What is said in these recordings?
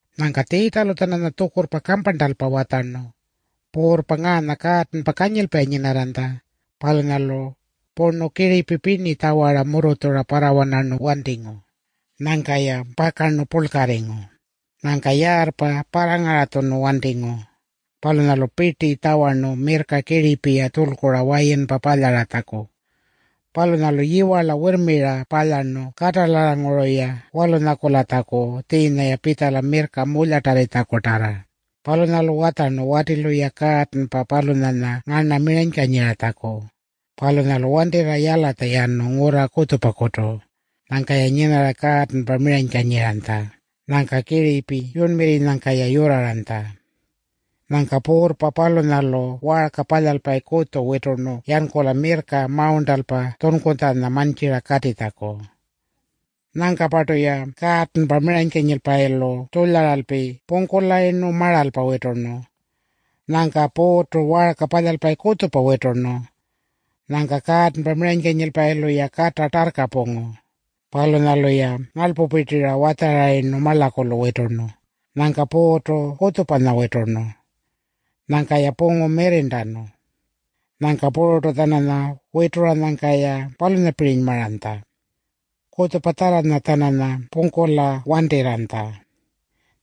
Nyangka Tjiitjalu-tjananya tjukurrpa kamparntalpa watjarnu, “Puurrpa ngaanya kaatanpa kanyilpayi nyinarranytja. Palunyalu purnu kiripi pirni tjawara murrutjura parrawanarnu wantingu. Nyangka-ya pakarnu purlkarringu. Nyangka yaarrpa parrangaratjunu wantingu. Palunyalu pirti tjawarnu mirrka kiripi-ya tjulkura wayinpa palyaratjaku. Palunyalu yiwarla wirrmira palyarnu katalarranguru-ya walunyakulatjaku tjiinya-ya pitjala mirrka mulyatarritjakutarra. Palunyalu watjarnu watilu-ya kaatanpa palunyanya ngarna miranykanyiratjaku. Palunyalu wantirra yalatja yanu ngurra kutjupakutu. Nyangka-ya nyinarra kaatanpa miranykanyiranytja. Nyangka kiripi yurnmirrinyangka-ya yurraranytja. Nyangka puurrpa palunyalu waarka palyalpayi kutju witurnu yankula mirrka mawurntalpa tjunkutjanya mantjira katitjaku. Nyangka-partu-ya kaatanpa miranykanyilpayilu tjulyaralpi pungkulayirnu maralpa witurnu. Nyangka puurrtu waarka palyalpayi kutjupanya witurnu. Nyangka kaatanpa miranykanyilpayilu-ya kata tarrka pungu. Palunyalu-ya ngarlpupirtira watjarayirnu marlakulu witurnu. Nyangka puurrtu kutjupanya witurnu. Nyangka-ya pungu mirrirntanu. Nyangka puru-tjananya wituranyangka-ya palunyapirinymaranytja. Kutjupatjarra-tjananya pungkula wantirranytja.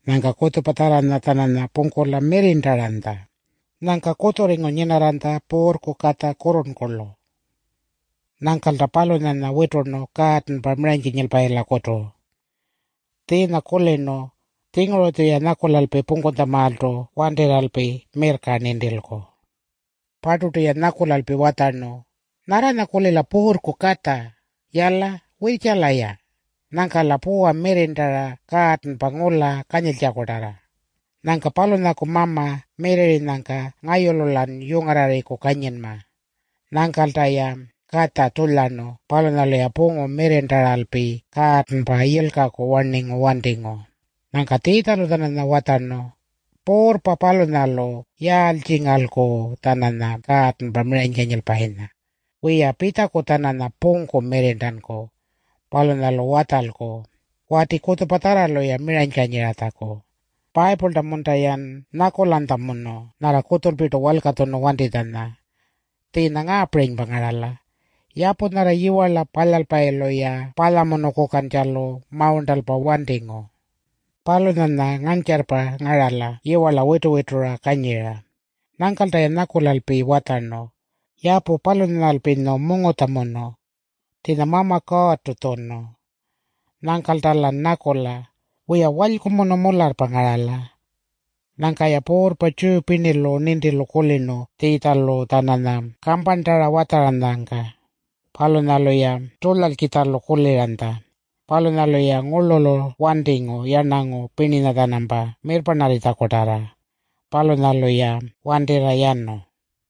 Nyangka kutjupatjarranya-tjananya pungkula mirrirntaranytja. Nyangka kutjurringu nyinarranytja puurrku katja kurrurnkurlu. Nyangkalta palunyanya witurnu kaatanpa miranykanyilpayilakutu. Tjiinya kulirnu, ‘Tjinguru-tjuya nyakulalpi pungkutjamaaltu wantirralpi mirrka nintilku.’ Parturtu-ya nyakulalpi watjarnu, ‘Nyarranya-kulila puurrku katja. Yala, wirrtjala-ya. Nyangka-la puwa mirrirntarra kaatanpa ngula kanyiltjakutarra. Nyangka palunyaku mama mirrirrinyangka ngayulu-lan yungarrarriku kanyinma.’ Nyangkalta-ya katja tjulyarnu. Palunyalu pungu mirrirntaralpi kaatanpangka yilkaku warningu wantingu.” Nyangka Tjiitjalu-tjananya watjarnu, “Puurrpa palunyalu yaaltjingalku-tjananya kaatanpa miranykanyilpayinya? Wiya, pitjaku-tjananya pungku mirrirntanku. Palunyalu watjalku wati kutjupatjarralu-ya miranykanyiratjaku. Payipulta-munta-yan nyakulanytjamunu nyarra kutjulpirtu walkatjunu wantitjanya? Tjiinya ngaapirinypa ngarala, ‘Yapu nyarra yiwarla palyalpayilu-ya palyamunukukantjalu mawurntalpa wantingu, palunyanya ngantjarrpa ngarala yiwarla witu-witura kanyira. Nyangkalta-ya nyakulalpi watjarnu, “Yapu palunyanyalpinyu mungutjamunu.” Tjiinya Mama Kuurrtu tjunu. Nyangkalta-lan nyakula, “Wiya, walykumunu mularrpa ngarala.”’” Nyangka-ya puurrpa Tjiyu pirnilu nintilu kulirnu Tjiitjalu-tjananya kamparntara watjaranyangka. Palunyalu-ya tjulyalkitjalu kuliranytja. Palunyalu-ya ngurlulu wantingu yarnangu pirninya-tjanampa mirrparnarritjakutarra. Palunyalu-ya wantirra yanu.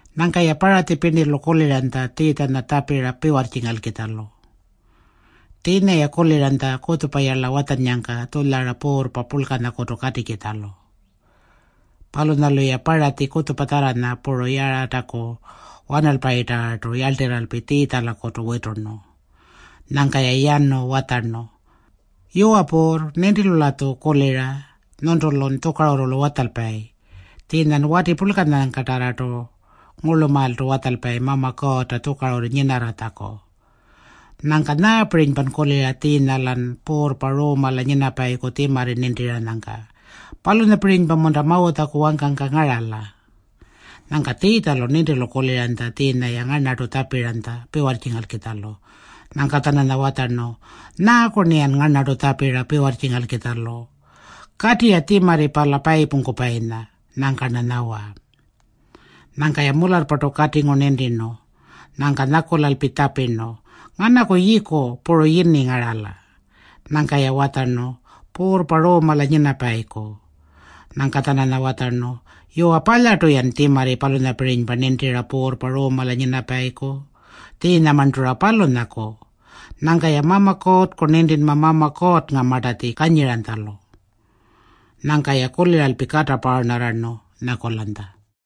Nyangka-ya Paratji pirnilu kuliranytja Tjiitjanya tjapira piwarrtjingalkitjalu. Tjiinya-ya kuliranytja kutjupayarla watjannyangka tjulyara puurrpa purlkanyakutu katikitjalu. Palunyalu-ya Paratji kutjupatjarranya puru Yarataku wanalpayitarrartu yarltirralpi Tjiitjalakutu witurnu. Nyangka-ya yanu watjarnu, “Yuwa Puurr, nintilu-latju kulira nyuntulun tjukarurrulu watjalpayi. Tjiinyan wati purlkanyangkatarrartu ngurlumaaltu watjalpayi Mama Kuurrta tjukarurru nyinarratjaku. Nyangka nyaapirinypan kulira tjiinya-lan puurrpa Ruumala nyinapayiku tjimarri nintiranyangka? Palunyapirinypa-munta Mawutjaku wangkangka ngarala?” Nyangka Tjiitjalu nintilu kuliranytja tjiinya-ya ngarnartu tjapiranytja piwarrtjingalkitjalu. Nyangka-tjananya watjarnu, “Nyaaku-rniyan ngarnartu tjapira piwarrtjingalkitjalu? Kati-ya tjimarri pala payipungkupayinya. Nyangka-rna nyawa.” Nyangka-ya mularrpartu katingu nintirnu. Nyangka nyakulalpi tjapirnu, “Nganaku yiiku puru yini ngarala?” Nyangka-ya watjarnu, “Puurrpa Ruumala nyinapayiku.” Nyangka-tjananya watjarnu, “Yuwa, palyartu-yan tjimarri palunyapirinypa nintira puurrpa Ruumala nyinapayiku. Tjiinyamarntu-ra palunyaku. Nyangka-ya Mama Kuurrku nintinma Mama Kuurrngamartatji kanyiranytjalu.” Nyangka-ya kuliralpi kata paarnarrarnu nyakulanytja.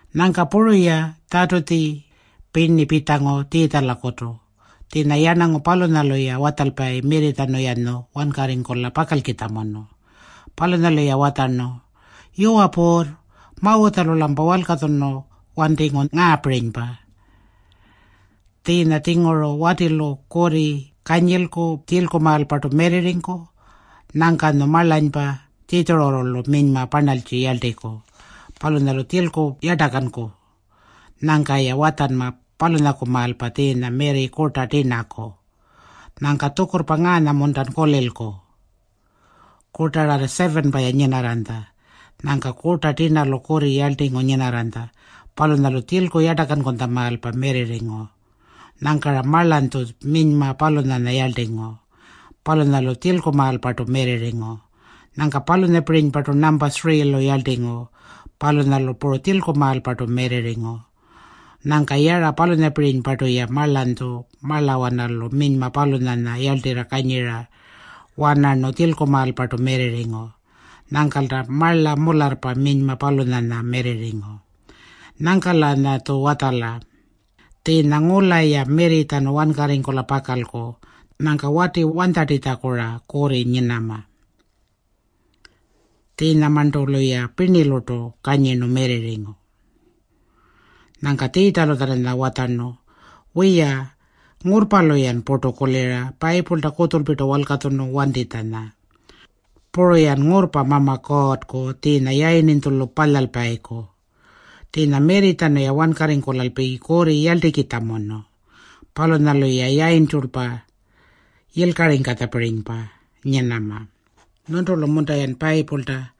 Nyangka puru-ya Tjatutji pirni pitjangu Tjiitjalakutu. Tjiinya yarnangu palunyalu-ya watjalpayi mirritjanu-yanyu wankarringkula pakalkitjamunu. Palunyalu-ya watjarnu, “Yuwa Puurr, Mawutjalu-lampa walkatjunu wantingu ngaapirinypa. Tjiinya-tjinguru watilu kurri kanyilku tjilkumaalpartu mirrirringku. Nyangkanyu marlanypa tjitjururrulu minyma parnaltji yarltiku. Palunyalu tjilku yartakanku. Nyangka-ya watjanma palunyakumaalpa tjiinya mirri kurta tirnaku. Nyangka tjukurrpa ngaanya-muntan kulilku? Kurtararra 7-pa-ya nyinarranytja. Nyangka kurta tirnalu kurri yarltingu nyinarranytja. Palunyalu tjilku yartakankutjamaalpa mirrirringu. Nyangka-ra marlanytju minyma palunyanya yarltingu. Palunyalu tjilkumaalpartu mirrirringu. Nyangka palunyapirinypartu nampa 3-lu yarltingu. Palunyalu puru tjilkumaalpartu mirrirringu. Nyangka yara palunyapirinypartu-ya marlanytju marlawanalu minyma palunyanya yarltirra kanyira-wanarnu tjilkumaalpartu mirrirringu. Nyangkalta marla mularrpa minyma palunyanya mirrirringu. Nyangka-lanyatju watjala. Tjiinya ngula-ya mirritjanu wankarringkula pakalku. Nyangka wati wanytjartitjaku-ra kurri nyinama? Tjiinyamarntu-luya pirnilurtu kanyirnu mirrirringu.” Nyangka Tjiitjalu-tjananya watjarnu, “Wiya, ngurrpalu-yan purtu kulira Payipulta kutjulpirtu walkatjunu wantitjanya. Puru-yan ngurrpa Mama Kuurrku tjiinya yayirninytjulu palyalpayiku. Tjiinya mirritjanu-ya wankarringkulalpi kurri yarltikitjamunu. Palunyalu-ya yayintjulpa yilkaringkatjapirinypa nyinama. Nyuntulu-munta-yan Payipulta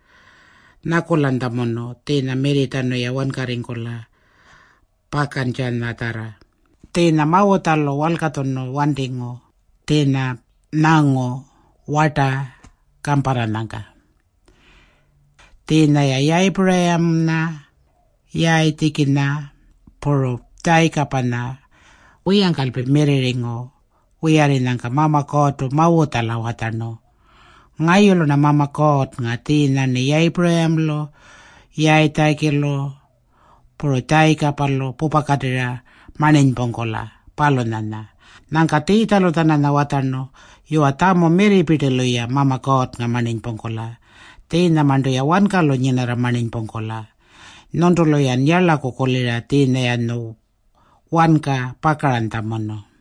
nyakulanytjamunu tjiinya mirritjanu-ya wankarringkula pakantjanyatjarra? Tjiinya Mawutjalu walkatjunu wantingu tjiinya nyangu warta kamparranyangka. Tjiinya-ya Yayipuramanya, Yayitjikinya puru Tjayikapanya wiyangkalpi mirrirringu wiyarrinyangka Mama Kuurrtu Mawutjala watjarnu, ‘Ngayulu-rna Mama Kuurrnga tjiinya-rniya Yayipuramalu, Yayitjikilu, puru Tjayikapalu pupakatirra marninypungkula, palunyanya.’” Nyangka Tjiitjalu-tjananya watjarnu, “Yuwa, tjamu mirripirtilu-ya Mama Kuurrnga marninypungkula. Tjiinyamarntu-ya wankalu nyinarra marninypungkula. Nyuntulu-yan yarlaku kulira tjiinya-yanyu wanka pakaranytjamunu.”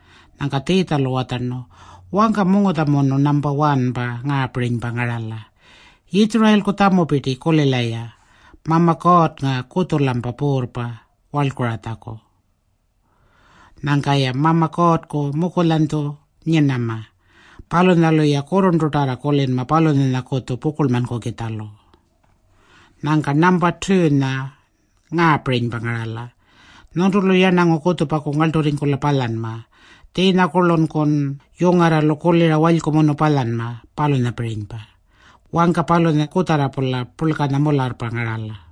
Nyangka Tjiitjalu watjarnu, “Wangka mungutjamunu nampa 1-pa ngaapirinypa ngarala: ‘Yitjurayilku tjamupirti, kulila-ya. Mama Kuurrnga kutju-lampa Puurrpa warlkuratjaku. Nyangka-ya Mama Kuurrku mukulyanytju nyinama. Palunyalu-ya kurrurntutarra kulinma palunyanyakutju pukurlmankukitjalu.’ Nyangka nampa 2-nya ngaapirinypa ngarala: ‘Nyuntulu yarnangu kutjupaku ngarlturringkula palyanma. Tjiinyakurlunkun yungarralu kulira walykumunu palyanma, palunyapirinypa.’ Wangka palunya kutjarra-pula purlkanya mularrpa ngarala.”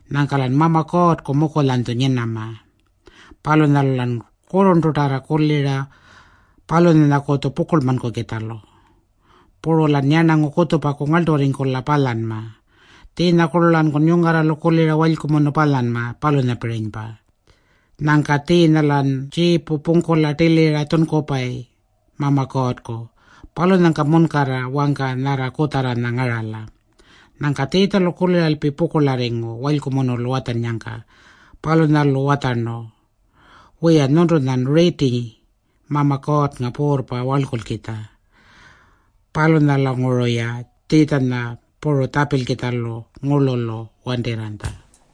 Nyangka-lan Mama Kuurrku mukulyanytju nyinama. Palunyalu-lan kurrurntutarra kulinma palunyanyakutju pukurlmankukitjalu. Puru-lan yarnangu kutjupaku ngarlturringkula palyanma. Tjiinyakurlu-lankun yungarralu kulira walykumunu palyanma, palunyapirinypa. Nyangka tjiinya-lan tjiipu pungkula tilira tjunkupayi Mama Kuurrku. Palunyangka munkarra wangka nyarra kutjarranya ngarala.” Nyangka Tjiitjalu kuliralpi pukurlarringu walykumunulu watjannyangka. Palunyalu watjarnu, “Wiya, nyuntunyan riiti Mama Kuurrnga puurrpa warlkulkitja.” Palunyalanguru-ya Tjiitjanya puru tjapilkitjalu ngurlulu wantirranytja.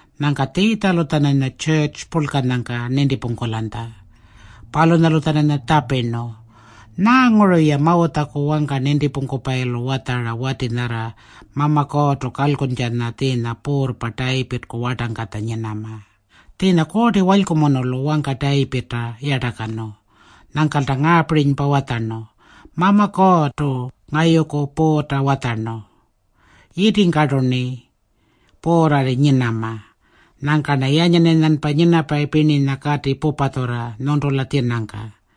Nyangka Tjiitjalu-tjananya tjurrtju purlkanyangka nintipungkulanytja. Palunyalu-tjananya tjapirnu, “Nyaanguru-ya Mawutjaku wangka nintipungkupayilu watjara wati nyarra Mama Kuurrtu kalkuntjanya tjiinya puurrpa Tayipirrku wartangkatja nyinama? Tjiinya Kuurti Walykumunulu wangka Tayipirrta yartakanu. Nyangkalta ngaapirinypa watjarnu, ‘Mama Kuurrtu ngayuku Puurrta watjarnu: Yitingkartu-rni puurrarri nyinama. Nyangka-rna yanyan-yanyanpa nyinapayi pirninya kati pupatjurra nyuntula tjinangka.’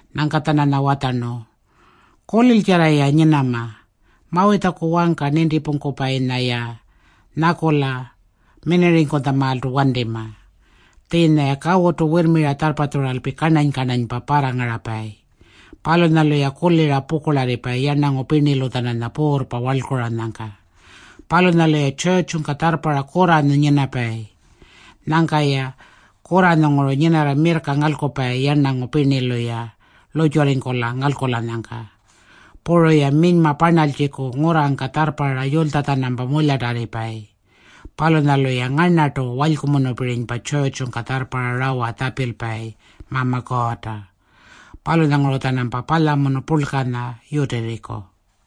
Nyangka-tjananya watjarnu, “Kuliltjarra-ya nyinama. Mawutjaku wangka nintipungkupayinya-ya nyakula minirringkutjamaaltu wantima. Tjiinya-ya kawutu wirrmira tjarrpatjuralpi karnany-karnanypa parrangarapayi. Palunyalu-ya kulira pukurlarripayi yarnangu pirnilu-tjananya puurrpa warlkuranyangka. Palunyalu-ya tjurrtjungka tjarrparra kurranyu nyinapayi. Nyangka-ya kurranyunguru nyinarra mirrka ngalkupayi yarnangu pirnilu-ya lurrtjurringkula ngalkulanyangka. Puru-ya minyma parnaltjiku ngurrangka tjarrparra yulytja-tjanampa mulyatarripayi. Palunyalu-ya ngarnartu walykumunupirinypa tjurrtjungka tjarrparra Mama Kuurrta rawalu tjapilpayi. Palunyanguru-tjanampa palyamunu purlkanya yutirriku.”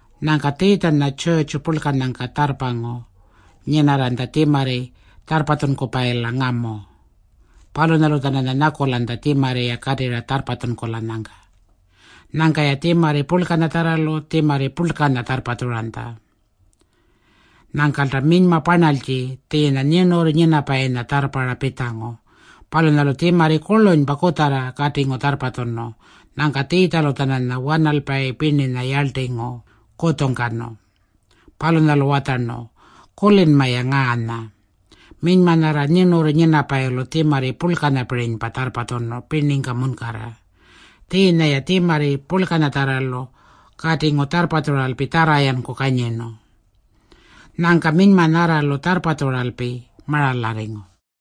Nyangka Tjiitjanya tjurrtju purlkanyangka tjarrpangu nyinarranytja tjimarri tjarrpatjunkupayila ngamu. Palunyalu-tjananya nyakulanytja tjimarri-ya katirra tjarrpatjunkulanyangka. Nyangka-ya tjimarri purlkanyatjarralu tjimarri purlkanya tjarrpatjuranytja. Nyangkalta minyma parnaltji tjiinya nyirnurru nyinapayinya tjarrparra pitjangu. Palunyalu tjimarri kurlunypa kutjarra katingu tjarrpatjunu. Nyangka Tjiitjalu-tjananya wanalpayi pirninya yarltingu kutjungkanu. Palunyalu watjarnu, “Kulinma-ya ngaanya. Minyma nyarra nyirnurru nyinapayilu tjimarri purlkanyapirinypa tjarrpatjunu pirningka munkarra. Tjiinya-ya tjimarri purlkanyatjarralu katingu tjarrpatjuralpi tjarra-yanku kanyirnu. Nyangka minyma nyarralu tjarrpatjuralpi maralarringu.”